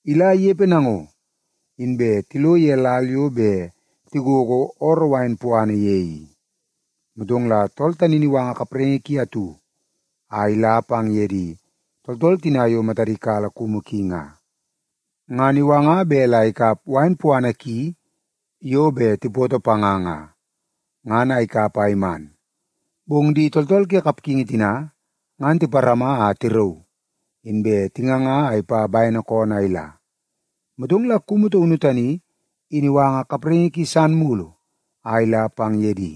Ila inepe nango, inbe tilo ye lal yo bet tigogo ooroo wain puana ye i, motong la tool tani in iwanga kapraingi ki atu a ila pang ye di tooltool tina yo matadi kala kumu ki nga. Ngan iwanga bet la ikap wain puana ki yo bet tipoto panga nga, ngan a ikap a iman. Bong di tooltool ke kapgingi tina ngan tiparama a tirauu, inbe tinganga a ipa bene koonoo a ila. Motong la kumu taunu tani in iwanga kapraingi ki san mulu a ila pang ye di.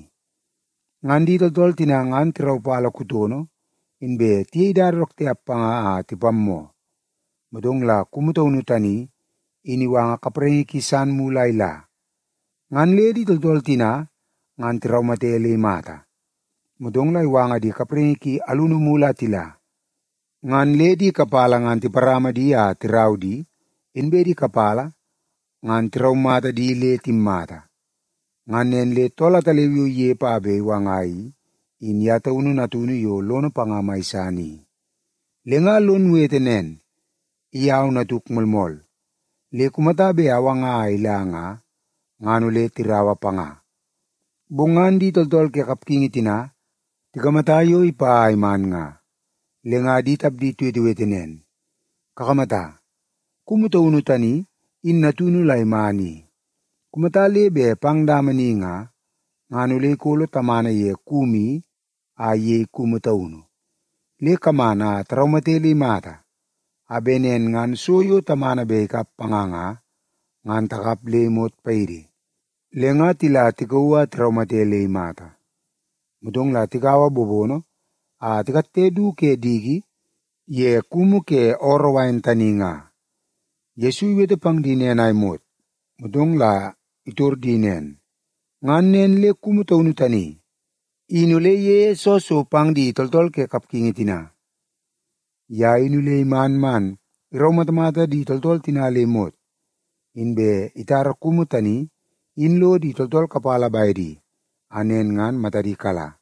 Ngan di tooltool tina ngan tiraupala kutono, inbe tiyei dada dook tiap panga a tipammoo. Motong la kumu taunu tani in iwanga kapraingi ki san mulu a ila. Ngan le di tooltool tina ngan tiraumate le imata. Motong la iwanga di kapraingi ki alunu mulu a tila, ngan le di kapala ngan tiparama di a tirau di, inbe di kapala ngan tiraumata di le timmata. “Ngan nen le tool ataleu yo inepe a bet iwanga i, in ye taunu natunu yo lono panga mai san i. Le nga lon wete nen, ‘I au natuk moolmool, le kumata bet awanga a ila nga, ngan ole tiraua panga.’ “Bong ngan di tooltool ke kapgingi tina tikamata yo ipa a iman nga, le nga di tapdi tiwetewete nen, ‘Kakamata, kumu taunu tani in natunu la iman i. Kumata le bet pang dama ni nga, ngan ole ikolo tamana ye kumu i a iyei kumu taunu. Le kaman a taraumate le imata, a bet nen ngan so yo tamana bet ikap panga nga, ngan takap le imot paidi.’ Le nga tila tikauu a tiraumate le imata, motong la tikaua bobono a tikatte du ke diki ye kumu ke ooroo wain tani nga.” Yesu iwete pang di nen a imot, motong la itor di nen, “Ngan nen le kumu taunu tani in ole iyeie soo so pang di tooltool ke kapgingi tina? Ye in ole iman man iraumatamata di tooltool tina le imot, inbe itara kumu tani in lo di tooltool kapala bedi a nen ngan matadi kala.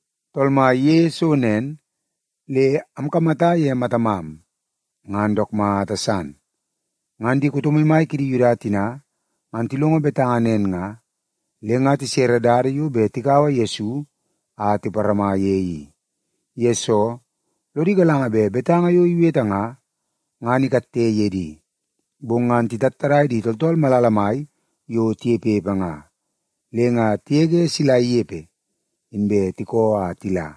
Tool Mai iyeie so nen, le amkamata ye matamam, ngan dook mata san.’” Ngan di kuto maimai kidi Yuda tina ngan tilongo betanga nen nga, le nga tisere dada yo bet tikaua Yesu a tiparama ye i. Yesoo, lodi galanga bet betanga yo iwete nga, ngan ikatte ye di. Bong ngan titattadai di tooltool malala mai yo tinepepe nga, le nga tigege sila inepe, inbe tikoo a tila.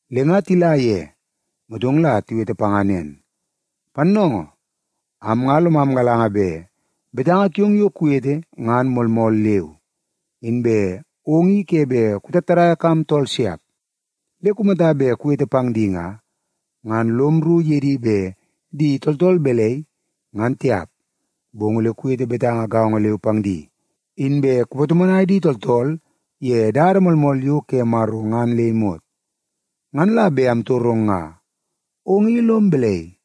Le nga tila ye, motong la tiwete panga nen, “Pannoongoo, am nga lomam galanga bet betanga kiong yo kuwete ngan moolmool leu. Inbe ong i ke bet kutattadaia kam tool siap. Le kumata bet kuwete pang di nga, ngan lom rru ye di bet di tooltool balai, ngan tiap, bong ole kuwete betanga gaongo leu pang di, inbe kupatomonai di tooltool ye dada moolmool yo ke Maro ngan le imot. Ngan la bet amtorong nga, ong i lom balai?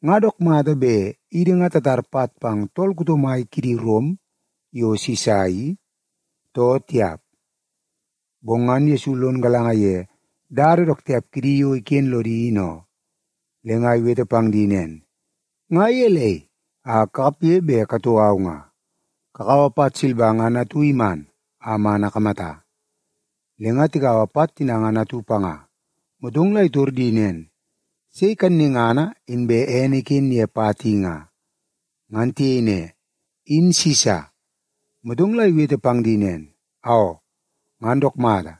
Nga dook mata bet idi nga tatar pat pang tool kuto mai kidi Rom yo Sisa i, too tiap?” Bong ngan Yesu lon galanga ye dada dook tiap kidi yo iken lodi in oo, le nga iwete pang di nen, “Nga gelei a kakapge bet katou au nga? Kakaua pat silba ngan atu iman a man akamata.” Le nga tikaua pat tina ngan atu panga, motong la itor di nen, “Sei kannungana inbe ene iken ye pat i nga?” Ngan tiyei ne, “In Sisa.” Motong la iwete pang di nen, “Aoo, ngan dook mata!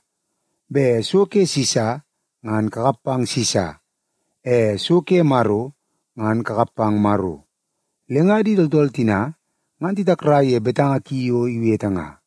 Bet so ke Sisa, ngan kakap pang Sisa. E so ke Maro, ngan kakap pang Maro.” Le nga di tooltool tina ngan titakrai ye betanga ki yo iwete nga.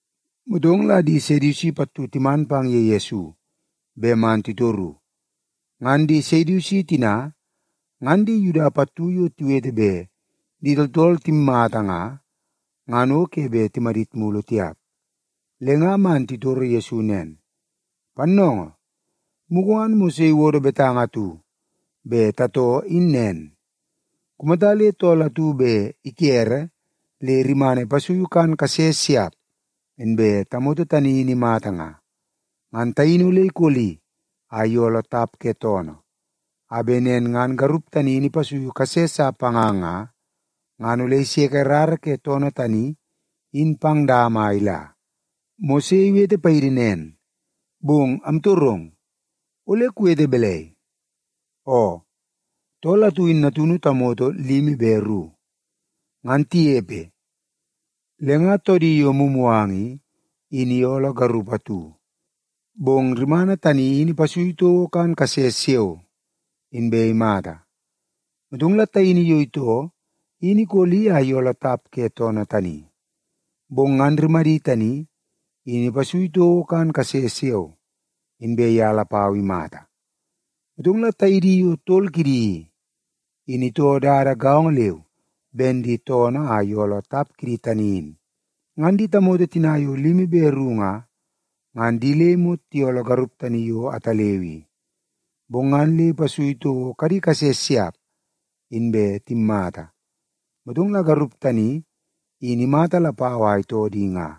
Motong la di Sedusi pattu timan pang ye Yesu bet man titoru. Ngan di Sedusi tina, ngan di Yuda pattu yo tiwete bet di tooltool timmata nga, ngan o ke bet timadit mulu tiap. Le nga man titoro Yesu nen, “Pannoongoo, mugu ngan Mose iwodo betanga atu bet tatoo in nen. Kumata le tool atu bet ikere le rimana ipasuiu kan kase siap, inbe tamoto tani in imata nga, ngan taini ole ikoli a iyooloo tap ke toonoo, a bet nen ngan garup tani in ipasui kase sa panga nga, ngan ole iseke rara ke toonoo tani in pang dama a ila. Mose iwete paidi nen, bong amtorong, ole kuwete balai? Oo, tool atu in natunu tamoto limi be ru. Ngan tinepe, le nga toodi yo mumuganga i, in iyooloo garup atu, bong rimana tani in ipasui toko kan kase siao, inbe imata. Motong la taini yo itoo in ikoli a iyooloo tap ke toonoo tani. Bong ngan rimadi tani in ipasui toko kan kase siao, inbe ye lapau imata. Motong la taidi yo tol kidi i, in itoo dada gaongo leu ben di toonoo a iyooloo tap kidi tani in. Ngan di tamoto tina yo limi be ru nga, ngan di le imot tiyooloo garup tani yo ataleu i. Bong ngan le ipasui toko kadi kase siap, inbe timmata. Motong la garup tani, in imata lapau a itoo di nga.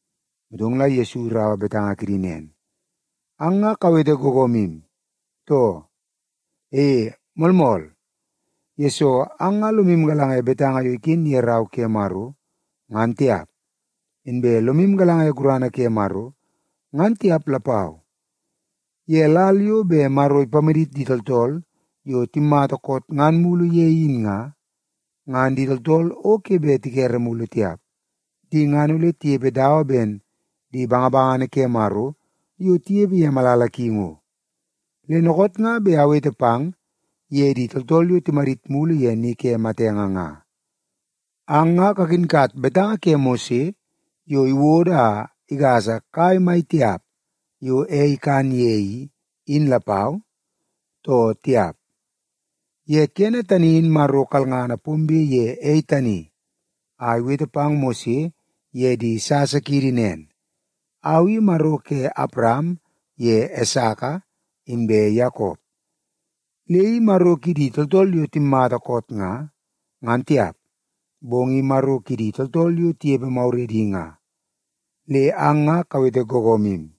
Motong la Yesu iraua betanga kidi nen, “Ang nga kawete googoomu, too? E, moolmool, yesoo ang nga lomu galanga ye betanga yo iken ye Rau ke Maro, ngan tiap. Inbe lomu galanga ye gurana ke Maro, ngan tiap lapau. Ye lal yo bet Maro ipamadit di tooltool yo timmata koot ngan mulu ye in nga, ngan di tooltool o ke bet tikere mulu tiap. Di ngan ole tinepe dawa ben di bangabangana ke Maro yo tinepe ye malala ki ngo. Le dookoot nga bet awete pang ye di tooltool yo timadit mulu ye ni ke matenge nga. Ang nga kakinkat betanga ke Mose yo iwodo a igasa kai mai tiap yo ei ikan ye i, in lapau, too tiap? Ye kene tani in Maro kalngana pombe ye ei tani a iwete pang Mose ye di sasa kiidi nen, ‘Au i Maro ke Awaram ye Esaka inbe Yakop.’ Le i Maro kidi tooltool yo timmata koot nga, ngan tiap, bong i Maro kidi tooltool yo tinepe maguredi nga. Le ang nga kawete googoomu.”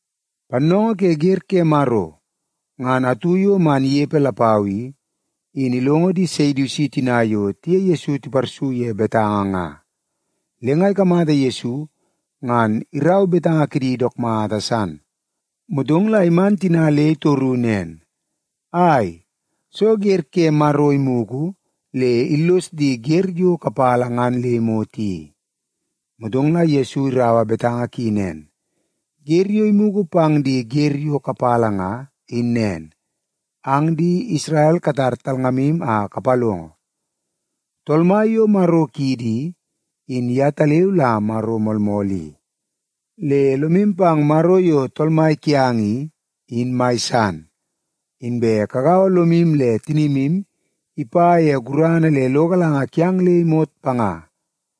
Pannoongoo ke wer ke Maro ngan atu yo man inepe lapau i, in ilongo di Sedusi tina yo tiye Yesu tiparsu ye betanga nga. Le nga ikamata Yesu ngan irau betanga kidi dook mata san. Motong la iman tina le itoru nen, “Ai, soo wer ke Maro imugu le illos di wer yo kapala ngan le imot i?” Motong la Yesu iraua betanga ki nen, “Wer yo imugu pang di wer yo kapala nga, in nen: ‘Ang di Isrel katar talngamu a kapalongo. Tool Mai yo Maro kiidi i, in yetaleu la Maro moolmool i. Le lomu pang Maro yo Tool Mai kiang i, in mai san, inbe kagaua lomu le tinimu ipa ye gurana le lo galanga kiang le imot panga.’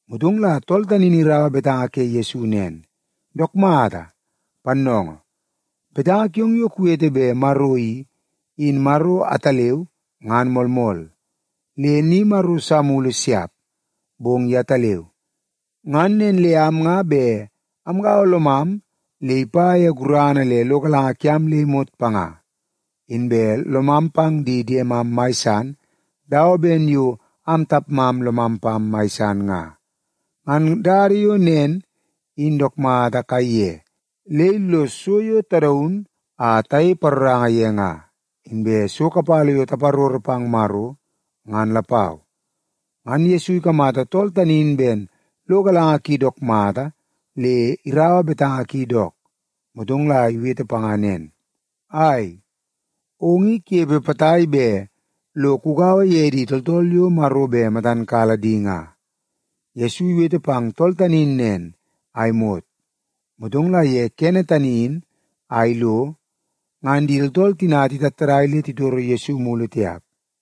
Motong la tool tani in iraua betanga ke Yesu nen, “Dook mata, pannoongoo! Betanga kiong yo kuwete bet Maro i, in Maro ataleu ngan moolmool. Le ni maro sa mulu siap, bong yetaleu. Ngan nen le am nga bet amgaua lomam le ipa ye gurana le lo galanga kiam le imot panga. Inbe lomam pang di diemam mai san dawa ben yo am tapmam lomam pam mai san nga. Ngan dada yo nen in dook mata kaiye le illos so yo tadaun a tayei paroranga ye nga, inbe so kapala yo taparoro pang Maro, ngan lapau.” Ngan Yesu ikamata tool tani in ben lo galanga ki dook mata le iraua betanga ki dook, motong la iwete panga nen, “Ai, ong i kunepe potai bet lo kugaua ye di tooltool yo Maro bet matan kala di nga.” Yesu iwete pang tool tani in nen a imot, motong la ye kene tani in a ilo ngan di tooltool tina titattadai le titoro Yesu mulu tiap.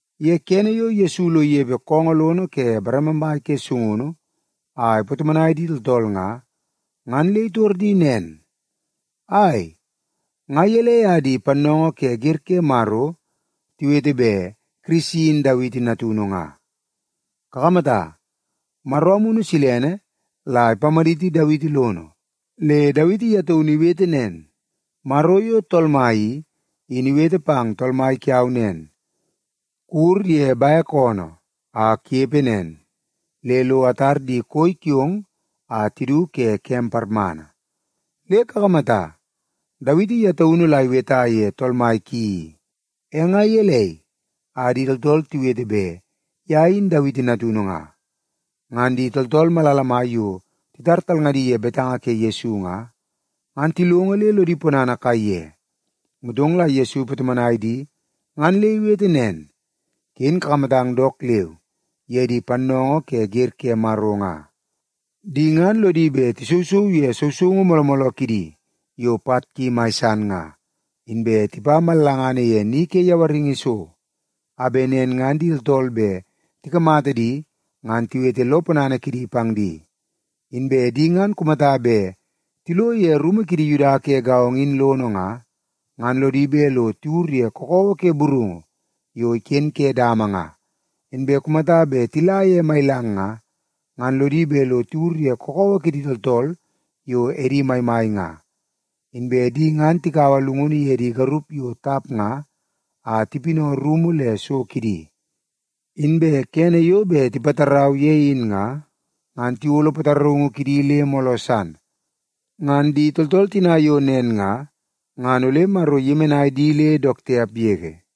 Ye kene yo Yesu lo inepe koongoo lono ke bareme mai ke sungunu a ipatomonai di tooltool nga, ngan le itor di nen, “Ai, nga gelei a di pannoongoo ke wer ke Maro tiwete bet Kirisi in Dawiti natunu nga? Kakamata, Maro Amunu Silene la ipamaditi Dawiti lono, le Dawiti ye taunu iwete nen, ‘Maro yo Tool Mai i, in iwete pang Tool Mai kiau nen. “Kuwur ye bek oonoo a kunepe nen le lo atar di koi kiong a tidu ke kem parmana.” ’ Le kakamata, Dawiti ye taunu la iweta ye Tool Mai ki i. E nga gelei a di tooltool tiwete bet ye in Dawiti natunu nga?” Ngan di tooltool malala mai yo titar talngadi ye betanga ke Yesu nga, ngan tilongo le lodi ponana kaiye. Motong la Yesu ipatomonai di ngan le iwete nen, “Ken kakamatang dook leu ye di pannoongoo ke wer ke Maro nga. Di ngan lodi bet tisousou ye sousoungu mooloo mooloo kidi yo pat ki mai san nga, inbe tipa mallangana ye ni ke yawaringi so, a bet nen ngan di tooltool bet tikamata di ngan tiwete lo ponana kidi pang di. Inbe di ngan kumata bet tilo ye rumu kidi Yuda ke gaongo in lono nga, ngan lodi bet lo tiwur ye kakawa ke burungu yo iken ke dama nga, inbe kumata bet tila ye mailang nga, ngan lodi bet lo tiwur ye kakawa kidi tooltool yo edi maimai nga. Inbe di ngan tikaua llungunu ye di garup yo tap nga a tipinau rumu le so kidi. Inbe kene yo bet tipatarau ye in nga, ngan tiyolo pataraungu kidi le mooloo san. Ngan di tooltool tina yo nen nga, ngan ole Maro iyemenai di le dook tiap yege.”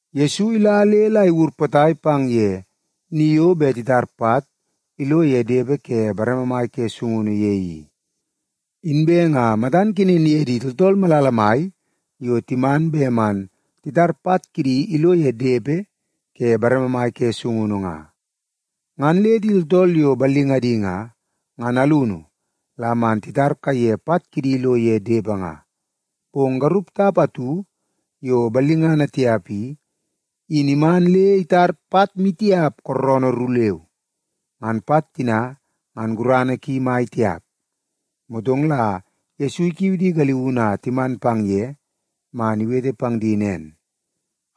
Yesu ila le la iwur potai pang ye ni yo bet titar pat ilo ye depe ke bareme mai ke sungunu ye i. Inbe nga matan kenen ye di tooltool malala mai yo timan bet man titar pat kidi ilo ye depe ke bareme mai ke sungunu nga. Ngan le di tooltool yo ballingadi nga, ngan alunu la man titar kaiye pat kidi ilo ye depe nga. Bong garup tap atu yo ballingana tiap i, in iman le itar pat maitiap kooroonoo ru leu. Ngan pat tina ngan gurana ki mai tiap. Motong la Yesu ikiu di galiunu a timan pang ye man iwete pang di nen,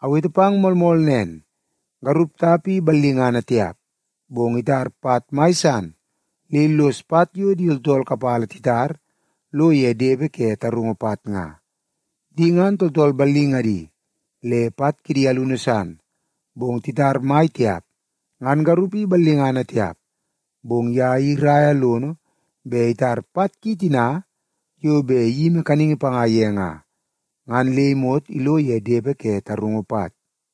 “Awete pang moolmool nen, garup tap i ballingana tiap, bong itar pat mai san le illos pat yo di tooltool kapala titar lo ye depe ke tarungu pat nga. Di ngan tooltool ballingadi le pat kidi alunu san, bong titar mai tiap. Ngan garup i ballingana tiap, bong ye in iraia lono bet itar pat ki tina yo bet iyimi kaningi panga ye nga, ngan le imot ilo ye depe ke tarungu pat.”